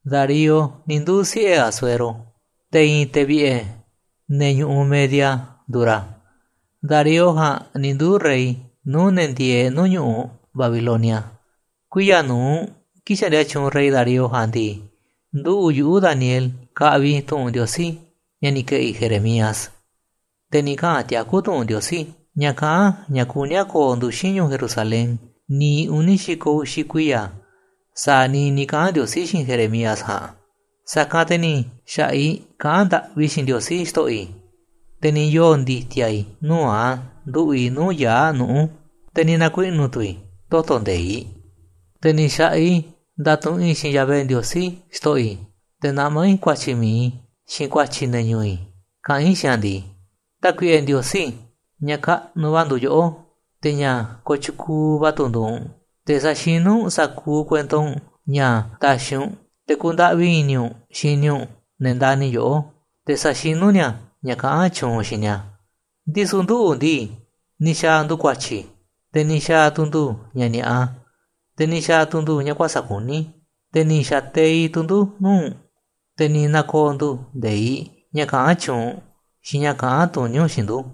“Darío ni̱ nduu̱ siꞌe̱ Asuero, te̱ i̱i̱n te̱ vi̱ꞌe̱ ne̱ ñu̱ꞌuꞌ Media nduuꞌ ra̱. Darío ja̱a̱nꞌ ni̱ nduuꞌ rey nuu̱ꞌ ne̱ ndieeꞌ nuu̱ꞌ ñu̱ꞌuꞌ Babilonia. Kuiya̱ nu̱uꞌ kii̱ꞌ xaꞌndia tyuunꞌ rey Darío ja̱a̱nꞌ ndii, nduꞌu̱ꞌ yuꞌu̱, Daniel, kaꞌviꞌ i̱ tu̱ꞌu̱n Ndiosí, ña̱ ni̱ ke̱ꞌi̱ Jeremías, te̱ ni̱ kaꞌa̱n tiakú tu̱ꞌu̱n Ndiosí, ña̱ kaꞌán ña̱ kuní a̱ ko̱o̱ nduxín ñu̱u̱ Jerusalén niiꞌ uni̱ xi̱ko̱ uxi̱ kuiya̱ sa̱a̱ niiꞌ ni̱ kaꞌa̱n Ndiosí xiinꞌ Jeremías ja̱a̱nꞌ. Sa̱kanꞌ te̱ ni̱ xa̱ꞌaꞌ i̱ kaꞌán ndaꞌvi i̱ xiinꞌ Ndiosí, xto̱ꞌo̱ i̱, te̱ ni̱ yoo̱ ndi̱ti̱a̱ i̱ nuu̱ꞌ a̱ nduꞌu̱ꞌ i̱ nuu̱ꞌ yaa̱ꞌ nuꞌu̱, te̱ ni̱ na̱kuiꞌnu̱ tu̱ i̱ toto̱ nde̱iꞌ. Te̱ ni̱ xa̱ꞌaꞌ i̱ ndatuꞌunꞌ i̱ xiinꞌ Yahvé Ndiosí, xto̱ꞌo̱ i̱, te̱ naꞌmá i̱ ku̱a̱tyi̱ mi̱iꞌ i̱, xiinꞌ ku̱a̱tyi̱ ne̱ ñu̱u̱ i̱ kaꞌán i̱ xiinꞌ a̱ ndii: “Tákuiꞌe Ndiosí, ña̱ kaꞌnuꞌ va̱ nduuꞌ yoꞌó, te̱ ña̱ kotyukuuꞌ va̱ tu̱ nduuꞌ u̱nꞌ. Te̱ sa̱xinú u̱nꞌ sa̱kuuꞌ kuento u̱nꞌ ña̱ taxiꞌ u̱nꞌ, te̱ kundaꞌvi i̱ni̱ u̱nꞌ xini u̱nꞌ ne̱ ndani̱ yoꞌó, te̱ saxinú ni̱a̱ ña̱ kaꞌán tyuunꞌ u̱nꞌ xiinꞌ ni̱a̱ Ndisu̱ nduꞌu̱ ndii, ni̱ xa̱a̱ ndu̱ ku̱a̱tyi̱, te̱ ni̱ xa̱a̱ tu̱ ndu̱ ña̱ ni̱a̱ꞌa, te̱ ni̱ xa̱a̱ tu̱ ndu̱ ña̱ kuäsa̱ꞌ kuní, te̱ ni̱ xa̱ teiꞌ tu̱ ndu̱ nuuꞌ u̱nꞌ, te̱ ni̱ na̱ko̱o̱ ndu̱ nde̱iꞌ, ña̱ kaꞌán tyuunꞌ u̱nꞌ, xiinꞌ ña̱ kaꞌán tuní u̱nꞌ xiinꞌ ndu̱.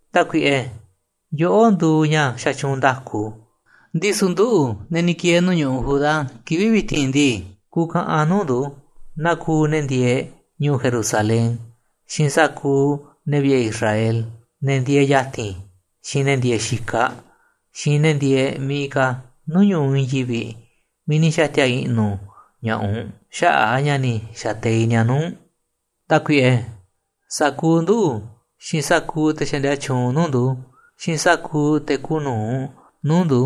Tákuiꞌe, yoꞌó nduuꞌ ña̱ xatyuunꞌ nda̱ku, ndisu̱ nduꞌu̱, ne̱ ni̱ ki̱e̱e̱ nuu̱ꞌ ñu̱ꞌuꞌ Judá, kivi̱ꞌ vi̱ti̱n ndii, kuuꞌ kaꞌanꞌ nuu̱ꞌ ndu̱, naa kuuꞌ ne̱ ndieeꞌ ñu̱u̱ Jerusalén, xiinꞌ sa̱kuuꞌ ne̱ vi̱ꞌe̱ Israel, ne̱ ndieeꞌ ya̱ti̱n, xiinꞌ ne̱ ndieeꞌ xikaꞌ, xiinꞌ ne̱ ndieeꞌ miiꞌ ka̱ nuu̱ꞌ ñu̱ꞌuꞌ i̱i̱n yivi̱ꞌ miiꞌ ni̱ xa̱ti̱a̱ i̱ꞌnu̱ ña̱ꞌaꞌ u̱nꞌ xaꞌa̱ꞌ a̱ ña̱ ni̱ xa̱teiꞌ ni̱a̱ nuu̱ꞌ u̱nꞌ. Tákuiꞌe, sa̱kuuꞌ nduꞌu̱, xiinꞌ sa̱kuuꞌ te̱ xaꞌndia tyuunꞌ nuu̱ꞌ ndu̱, xiinꞌ sa̱kuuꞌ te̱ kuuꞌ nu̱uꞌ nuu̱ꞌ ndu̱,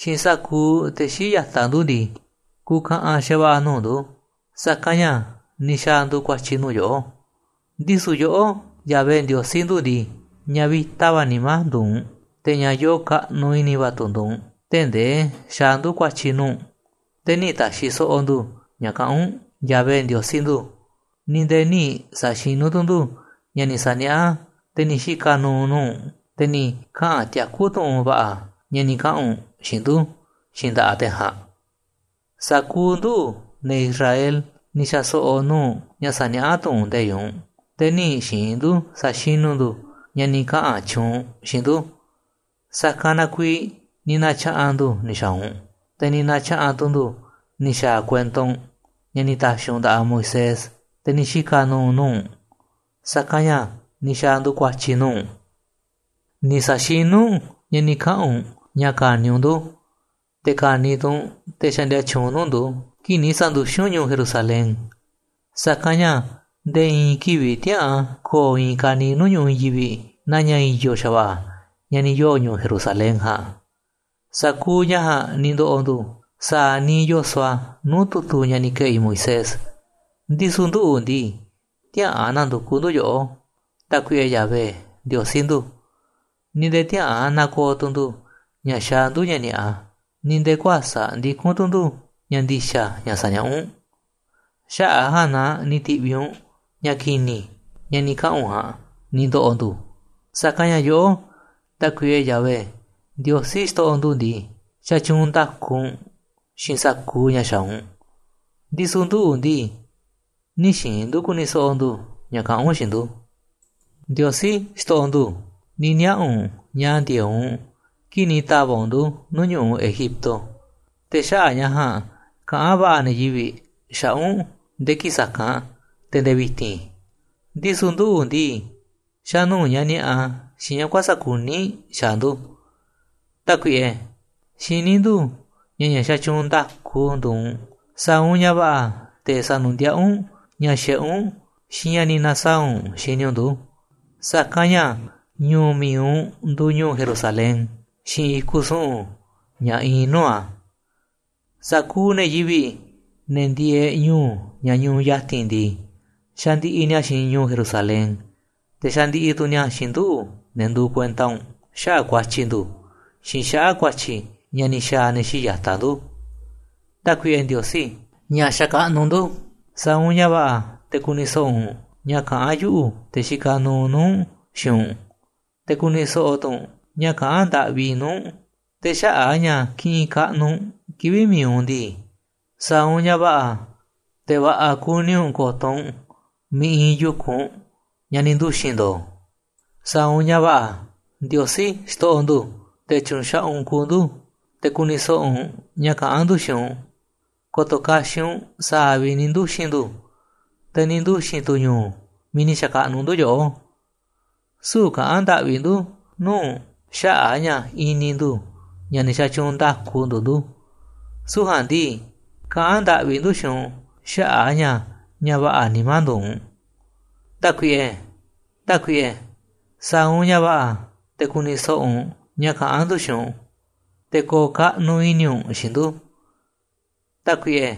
xiinꞌ sa̱kuuꞌ te̱ xii̱ꞌ ya̱taꞌ ndu̱ ndii, kuuꞌ kaꞌanꞌ xa̱va̱ꞌa̱ nuu̱ꞌ ndu̱, sa̱kanꞌ ña̱ ni̱ xa̱a̱ ndu̱ ku̱a̱tyi̱ nuu̱ꞌ yoꞌó. Ndisu̱ yoꞌó, Yahvé Ndiosí ndu̱ ndii, ña̱ vi̱ta va̱ nimá nduuꞌ u̱nꞌ, te̱ ña̱ yoo kaꞌnuꞌ i̱ni̱ va̱ tu̱ nduuꞌ u̱nꞌ, tee̱ꞌ ndee xaaꞌ ndu̱ ku̱a̱tyi̱ nuu̱ꞌ u̱nꞌ. Te̱ nï̱ ta̱xi̱ so̱ꞌo̱ ndu̱ ña̱ kaꞌán u̱nꞌ, Yahvé Ndiosí ndu̱, ni̱ nde̱e̱ nï̱ sa̱xinú tu̱ ndu̱ ña̱ ni̱ sa̱niaꞌá te̱ ni̱ xika̱ nu̱u̱ nuu̱ꞌ u̱nꞌ, te̱ ni̱ kaꞌa̱n tiakú tu̱ꞌu̱n va̱ꞌa̱ ña̱ ni̱ kaꞌa̱n u̱nꞌ xiinꞌ ndu̱ xiinꞌ nda̱ꞌaꞌ te̱ ja̱a̱nꞌ. Sa̱kuuꞌ nduꞌu̱, ne̱ Israel, ni̱ xa̱ so̱ꞌo̱ nuu̱ꞌ ña̱ sa̱niaꞌá tu̱ꞌu̱n nde̱iꞌ u̱nꞌ, te̱ nï̱ xi̱i̱n ndu̱ sa̱xinú ndu̱ ña̱ ni̱ kaꞌa̱n tyuunꞌ u̱nꞌ xiinꞌ ndu̱, sa̱kanꞌ na kuiiꞌ ni̱ na̱tya̱ꞌa̱n ndu̱ ni̱ xa̱a̱ u̱nꞌ, te̱ ni̱ na̱tya̱ꞌa̱n tu̱ ndu̱ ni̱ xa̱a̱ kuento u̱nꞌ, ña̱ ni̱ ta̱xi̱ u̱nꞌ nda̱ꞌaꞌ Moisés, te̱ ni̱ xika̱ nuuꞌ nuu̱ꞌ u̱nꞌ, sa̱kanꞌ ña̱ ni̱ xa̱a̱ ndu̱ ku̱a̱tyi̱ nuu̱ꞌ u̱nꞌ. Ni̱ sa̱xinú u̱nꞌ ña̱ ni̱ kaꞌa̱n u̱nꞌ ña̱ ka̱ni̱ u̱nꞌ ndu̱, te̱ ka̱ni̱ tu̱ u̱nꞌ te̱ xaꞌndia tyuunꞌ nuu̱ꞌ ndu̱, kii̱ꞌ ni̱ sa̱nduxín u̱nꞌ ñu̱u̱ Jerusalén. Sa̱kanꞌ ña̱ nde̱e̱ i̱i̱n kivi̱ꞌ tiäꞌa̱an ko̱o̱ i̱i̱n ka̱niiꞌ nuu̱ꞌ ñu̱ꞌuꞌ i̱i̱n yivi̱ꞌ naa ña̱ i̱yo̱ xa̱va̱ꞌa̱ ña̱ ni̱ yoo̱ ñu̱u̱ Jerusalén ja̱a̱nꞌ. Sa̱kuuꞌ ña̱ ja̱a̱nꞌ ni̱ ndo̱ꞌo̱ ndu̱, sa̱a̱ niiꞌ yoso̱ꞌ a̱ nuu̱ꞌ tu̱tu̱ ña̱ ni̱ ke̱ꞌi̱ Moisés, ndisu̱ nduꞌu̱ ndii, tiäꞌa̱an na̱ndu̱kuꞌ ndu̱ yoꞌó, Tákuiꞌe Yahvé Ndiosí ndu̱, ni̱ nde̱e̱ tiäꞌa̱an na̱ko̱o̱ tu̱ ndu̱ ña̱ xaaꞌ ndu̱ ña̱ ni̱a̱ꞌa, ni̱ nde̱e̱ kuäsa̱ꞌ ndikún tu̱ ndu̱ ña̱ ndi̱xa̱ ña̱ saniaꞌá u̱nꞌ. Xaꞌa̱ꞌ a̱ ja̱a̱nꞌ na ni̱ ti̱ꞌviꞌ u̱nꞌ ña̱ ki̱ni̱, ña̱ ni̱ kaꞌa̱n u̱nꞌ ja̱a̱nꞌ, ni̱ ndo̱ꞌo̱ ndu̱, sa̱kanꞌ ña̱ yoꞌó, Tákuiꞌe Yahvé Ndiosí xto̱ꞌo̱ ndu̱ ndii, xatyuunꞌ nda̱ku u̱nꞌ xiinꞌ sa̱kuuꞌ ña̱ xaaꞌ u̱nꞌ, ndisu̱ nduꞌu̱ ndii, nï̱ xi̱i̱n ndu̱ ku̱ni̱ so̱ꞌo̱ ndu̱ ña̱ kaꞌán u̱nꞌ xiinꞌ ndu̱. “Ndiosí, xto̱ꞌo̱ ndu̱, ni̱ niaꞌa̱ u̱nꞌ ña̱ ndi̱e̱eꞌ u̱nꞌ kii̱ꞌ ni̱ ta̱va̱ꞌ u̱nꞌ ndu̱ nuu̱ꞌ ñu̱ꞌuꞌ Egipto, te̱ xaꞌa̱ꞌ ña̱ ja̱a̱nꞌ kaꞌán va̱ꞌa̱ ne̱ yivi̱ꞌ xaꞌa̱ꞌ u̱nꞌ nde̱e̱ kii̱ꞌ sa̱kanꞌ te̱ nde̱e̱ vi̱ti̱n. Ndisu̱ nduꞌu̱ ndii, xa̱ nuu̱ꞌ ña̱ ni̱a̱ꞌa, xiinꞌ ña̱ kuäsa̱ kuní xaaꞌ ndu̱. Tákuiꞌe, xiní ndu̱ ña̱ ña̱ xatyuunꞌ nda̱ku nduuꞌ u̱nꞌ, sa̱a̱ u̱nꞌ ña̱ va̱ꞌa̱ te̱ sa̱nu̱ndiaꞌá u̱nꞌ ña̱ xiꞌé u̱nꞌ, xiinꞌ ña̱ ni̱ na̱saa̱ꞌ u̱nꞌ xini u̱nꞌ ndu̱, sa̱kanꞌ ña̱ ñu̱u̱ mi̱iꞌ u̱nꞌ nduuꞌ ñu̱u̱ Jerusalén, xiinꞌ i̱kuꞌ su̱ꞌu̱n ña̱ iinꞌ nuu̱ꞌ a̱. Sa̱kuuꞌ ne̱ yivi̱ꞌ, ne̱ ndieeꞌ ñu̱u̱ ña̱ ñuꞌuꞌ ya̱ti̱n ndii, xandiꞌiꞌ ni̱a̱ xiinꞌ ñu̱u̱ Jerusalén, te̱ xandiꞌiꞌ tu̱ ni̱a̱ xiinꞌ nduꞌu̱, ne̱ nduuꞌ kuenta u̱nꞌ, xaꞌa̱ꞌ ku̱a̱tyi̱ ndu̱, xiinꞌ xaꞌa̱ꞌ ku̱a̱tyi̱ ña̱ ni̱ xa̱a̱ ne̱ xii̱ꞌ ya̱taꞌ ndu̱. Tákuiꞌe Ndiosí, ña̱ xakaꞌnuꞌ ndu̱, sa̱a̱ u̱nꞌ ña̱ va̱ꞌa̱ te̱ ku̱ni̱ so̱ꞌo̱ u̱nꞌ ña̱ kaꞌán yuꞌu̱, te̱ xikaꞌ nuuꞌ nuu̱ꞌ u̱nꞌ, xiinꞌ u̱nꞌ, te̱ ku̱ni̱ so̱ꞌo̱ tu̱ u̱nꞌ ña̱ kaꞌán ndaꞌvi i̱ nuu̱ꞌ u̱nꞌ. Te̱ xaꞌa̱ꞌ a̱ ña̱ kiꞌinꞌ kaꞌnuꞌ u̱nꞌ kivi̱ꞌ mi̱iꞌ u̱nꞌ ndii, sa̱a̱ u̱nꞌ ña̱ va̱ꞌa̱ te̱ va̱ꞌa̱ kuni u̱nꞌ ko̱to̱ u̱nꞌ miiꞌ iinꞌ yu̱kunꞌ, ña̱ ni̱ nduxi̱n ndo̱o̱. Sa̱a̱ u̱nꞌ ña̱ va̱ꞌa̱, Ndiosí, xto̱ꞌo̱ ndu̱, te̱ tyu̱nxaꞌaꞌ u̱nꞌ kuuꞌ ndu̱, te̱ ku̱ni̱ so̱ꞌo̱ u̱nꞌ ña̱ kaꞌán ndu̱ xiinꞌ u̱nꞌ. Ko̱to̱ kaxiꞌ u̱nꞌ sa̱a̱ vi̱ꞌ ni̱ nduxi̱n ndu̱, te̱ ni̱ nduxi̱n tu̱ ñu̱u̱ miiꞌ ni̱ xa̱kaꞌnuꞌ ndu̱ yoꞌó. Süu̱ꞌ kaꞌán ndaꞌvi ndu̱ nuu̱ꞌ u̱nꞌ xaꞌa̱ꞌ a̱ ña̱ i̱ni̱ ndu̱ ña̱ ne̱ xatyuunꞌ nda̱ku nduuꞌ ndu̱, süu̱ꞌ ja̱a̱nꞌ ndii, kaꞌán ndaꞌvi ndu̱ xiinꞌ u̱nꞌ xaꞌa̱ꞌ a̱ ña̱ ña̱ va̱ꞌa̱ nimá nduuꞌ u̱nꞌ. ¡Tákuiꞌe, Tákuiꞌe, sa̱a̱ u̱nꞌ ña̱ va̱ꞌa̱ te̱ ku̱ni̱ so̱ꞌo̱ u̱nꞌ ña̱ kaꞌán ndu̱ xiinꞌ u̱nꞌ! ¡Te̱ ko̱o̱ kaꞌnuꞌ i̱ni̱ u̱nꞌ xiinꞌ ndu̱! ¡Tákuiꞌe,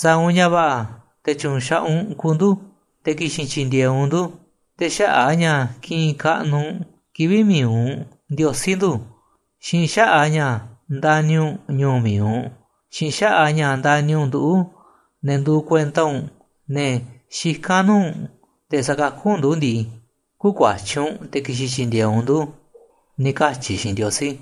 sa̱a̱ u̱nꞌ ña̱ va̱ꞌa̱ te̱ tyu̱nxaꞌaꞌ u̱nꞌ kuuꞌ ndu̱, te̱ ki̱xi̱n tyi̱ndi̱e̱eꞌ u̱nꞌ ndu̱! Te̱ xaꞌa̱ꞌ a̱ ña̱ kiꞌinꞌ kaꞌnuꞌ u̱nꞌ kivi̱ꞌ mi̱iꞌ u̱nꞌ, Ndiosí ndu̱, xiinꞌ xaꞌa̱ꞌ a̱ ña̱ ndani̱ u̱nꞌ ñu̱u̱ mi̱iꞌ u̱nꞌ, xiinꞌ xaꞌa̱ꞌ a̱ ña̱ ndani̱ u̱nꞌ nduꞌu̱, ne̱ nduuꞌ kuenta u̱nꞌ, ne̱ xikán nuu̱ꞌ u̱nꞌ, te̱ sa̱kakú u̱nꞌ ndu̱ ndii, kü̱kuatyí u̱nꞌ te̱ ki̱xi̱n tyi̱ndi̱e̱eꞌ u̱nꞌ ndu̱, ni̱ katyi̱ i̱ xiinꞌ Ndiosí.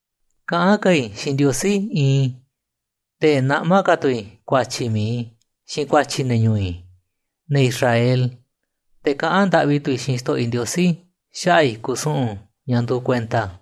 “Kaꞌán ka̱ i̱ xiinꞌ Ndiosí iinꞌ i̱, te̱ naꞌmá ka̱ tu̱ i̱ ku̱a̱tyi̱ mi̱iꞌ i̱, xiinꞌ ku̱a̱tyi̱ ne̱ ñu̱u̱ i̱, ne̱ Israel, te̱ kaꞌán ndaꞌvi tu̱ i̱ xiinꞌ xto̱ꞌo̱ i̱ Ndiosí xaꞌa̱ꞌ i̱kuꞌ su̱ꞌu̱n ña̱ nduuꞌ kuenta a̱.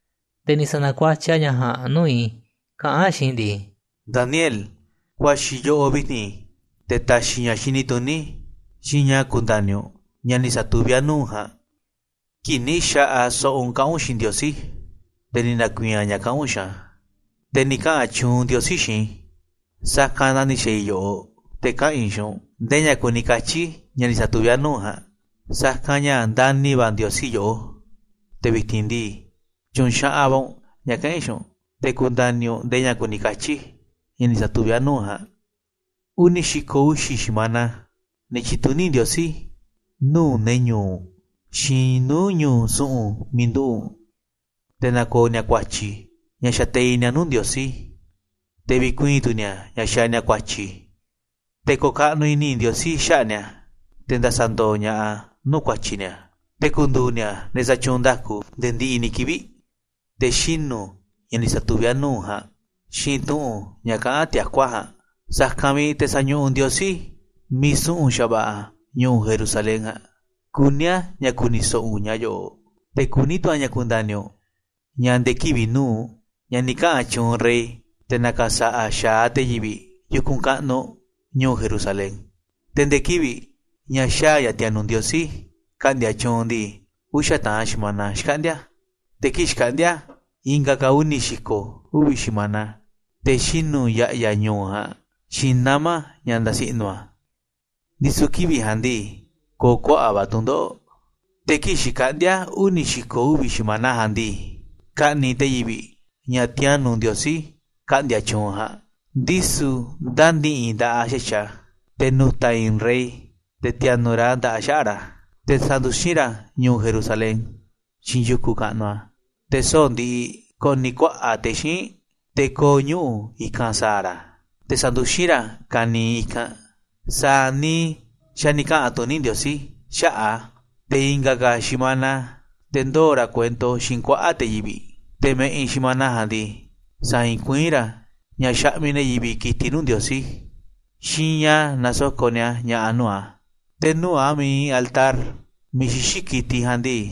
Te̱ ni̱ sa̱na̱kuatyiꞌ a̱ ña̱ ja̱a̱nꞌ nuu̱ꞌ i̱, kaꞌán a̱ xiinꞌ i̱ ndii: ‘Daniel, kuaxi̱ i̱ yoꞌoꞌ vi̱ti̱n te̱ ta̱xi̱ i̱ ña̱ xini tuní, xiinꞌ ña̱ ku̱nda̱ni̱ u̱nꞌ ña̱ ni̱ sa̱tuví a̱ nuu̱ꞌ u̱nꞌ ja̱a̱nꞌ. Kii̱ꞌ ni̱ xa̱ꞌaꞌ so̱ꞌo̱ u̱nꞌ kaꞌán u̱nꞌ xiinꞌ Ndiosí, te̱ ni̱ na̱ku̱i̱i̱n a̱ ña̱ kaꞌán u̱nꞌ xiinꞌ a̱. Te̱ ni̱ kaꞌa̱n tyuunꞌ Ndiosí xiinꞌ i̱, sa̱kanꞌ na ni̱ xa̱a̱ i̱ yoꞌoꞌ te̱ kaꞌa̱n i̱ xiinꞌ u̱nꞌ ndee ña̱ kuni katyi̱ ña̱ ni̱ sa̱tuví a̱ nuu̱ꞌ u̱nꞌ ja̱a̱nꞌ, sa̱kanꞌ ña̱ ndani̱ va̱ Ndiosí yoꞌó. Te̱ vi̱ti̱n ndii, tyu̱u̱n xaꞌaꞌ va̱ u̱nꞌ ña̱ kaꞌa̱n i̱ xiinꞌ u̱nꞌ te̱ ku̱nda̱ni̱ u̱nꞌ ndee ña̱ kuni katyi̱ ña̱ ni̱ sa̱tuví a̱ nuu̱ꞌ u̱nꞌ ja̱a̱nꞌ. ‘Uni̱ xi̱ko̱ uxi̱ xi̱mana ni̱ tyi̱tuní Ndiosí nuu̱ꞌ ne̱ ñu̱u̱ u̱nꞌ, xiinꞌ nuu̱ꞌ ñu̱u̱ su̱ꞌu̱n miiꞌ nduꞌu̱ꞌ u̱nꞌ, te̱ na̱ko̱o̱ ni̱a̱ ku̱a̱tyi̱ ña̱ xateiꞌ ni̱a̱ nuu̱ꞌ Ndiosí, te̱ vi̱kuii̱n tu̱ ni̱a̱ ña̱ xaaꞌ ni̱a̱ ku̱a̱tyi̱, te̱ ko̱o̱ ka̱ꞌnuꞌ i̱ni̱ Ndiosí xaꞌa̱ꞌ ni̱a̱, te̱ nda̱sa̱ndo̱o̱ ña̱ꞌaꞌ a̱ nuu̱ꞌ ku̱a̱tyi̱ ni̱a̱, te̱ ku̱ndu̱u̱ ni̱a̱ ne̱ xatyuunꞌ nda̱ku nde̱e̱ ndiꞌiꞌ ni̱ kivi̱ꞌ, te̱ xinu̱ ña̱ ni̱ sa̱tuví a̱ nuu̱ꞌ u̱nꞌ ja̱a̱nꞌ, xiinꞌ tu̱ꞌu̱n ña̱ kaꞌán tiakú a̱ ja̱a̱nꞌ, sa̱kanꞌ vi̱ꞌ te̱ sa̱ñuꞌuꞌ Ndiosí miiꞌ su̱ꞌu̱n xa̱va̱ꞌa̱ ñu̱u̱ Jerusalén ja̱a̱nꞌ. Kuní a̱ ña̱ ku̱ni̱ so̱ꞌo̱ u̱nꞌ ña̱ yo̱ꞌo̱ꞌ, te̱ kuní tu̱ a̱ ña̱ kunda̱ni̱ u̱nꞌ ña̱ nde̱e̱ kivi̱ꞌ nu̱uꞌ ña̱ ni̱ kaꞌa̱n tyuunꞌ rey, te̱ na̱ka̱sa̱ꞌa̱ xa̱aꞌ te̱ yivi̱ꞌ yu̱kunꞌ kaꞌnuꞌ ñu̱u̱ Jerusalén, te̱ nde̱e̱ kivi̱ꞌ ña̱ xaa̱ ña̱ ti̱a̱nu̱ꞌ Ndiosí ka̱ꞌndi̱a̱ tyuunꞌ ndii, uxa̱ taꞌan xi̱mana xkaꞌndi̱a̱. Te̱ kii̱ꞌ xkaꞌndi̱a̱ i̱nga̱ ka̱ uni̱ xi̱ko̱ uvi̱ xi̱mana te̱ xinu̱ ya̱ꞌya̱ ñu̱u̱ ja̱a̱nꞌ, xiinꞌ nama̱ ña̱ ndasi i̱ꞌnu̱ a̱, ndisu̱ kivi̱ꞌ ja̱a̱nꞌ ndii, ko̱o̱ kuaꞌa̱ꞌ va̱ tu̱ndoꞌo̱ꞌ. Te̱ kii̱ꞌ xkaꞌndi̱a̱ uni̱ xi̱ko̱ uvi̱ xi̱mana ja̱a̱nꞌ ndii, ka̱ꞌni̱ꞌ te̱ yivi̱ꞌ ña̱ ti̱a̱nu̱ꞌ Ndiosí ka̱ꞌndi̱a̱ tyuunꞌ ja̱a̱nꞌ, ndisu̱ ndä̱ni̱ꞌi̱ nda̱ꞌaꞌ xa̱tyiꞌ a̱, te̱ nu̱ta̱ i̱i̱n rey, te̱ ti̱a̱nu̱ꞌ ra̱ nda̱ꞌaꞌ xaꞌa̱ꞌ ra̱, te̱ sa̱nduxín ra̱ ñu̱u̱ Jerusalén, xiinꞌ yu̱kunꞌ kaꞌnuꞌ a̱, te̱ soꞌo̱ꞌ ndiꞌiꞌ ko̱ꞌni̱ kuaꞌa̱ꞌ te̱ xíinꞌ, te̱ ko̱o̱ ñuꞌu̱ i̱kanꞌ sa̱a̱ ra̱, te̱ sa̱nduxín ra̱ ka̱niiꞌ i̱kanꞌ sa̱a̱ niiꞌ xa̱ ni̱ kaꞌa̱n tuní Ndiosí xaꞌa̱ꞌ a̱. Te̱ i̱nga̱ ka̱ xi̱mana te̱ ndoo̱ ra̱ kuento xiinꞌ kuaꞌa̱ꞌ te̱ yivi̱ꞌ, te̱ ma̱ꞌiꞌ xi̱mana ja̱a̱nꞌ ndii, sa̱i̱i̱n kuiín ra̱ ña̱ xaꞌmiꞌ ne̱ yivi̱ꞌ ki̱tiꞌ nuu̱ꞌ Ndiosí, xiinꞌ ña̱ nasoko̱ꞌ ni̱a̱ ña̱ꞌa̱ nuu̱ꞌ a̱. Te̱ nuu̱ꞌ a̱ miiꞌ iinꞌ altar miiꞌ xixí ki̱tiꞌ ja̱a̱nꞌ ndii,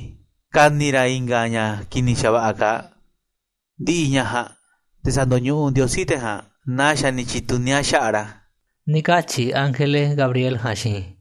ka̱ni̱ ra̱ i̱nga̱ ña̱ ki̱ni̱ xa̱va̱ꞌa̱ kaaꞌ. Ndi̱ꞌi̱ ña̱ ja̱a̱nꞌ te̱ sa̱ndo̱ñuꞌuꞌ Ndiosí te̱ ja̱a̱nꞌ naa xa̱ ni̱ tyi̱tuní a̱ xaꞌa̱ꞌ ra̱.’” Ni̱ katyi̱ ángele Gabriel ja̱a̱nꞌ xiinꞌ i̱.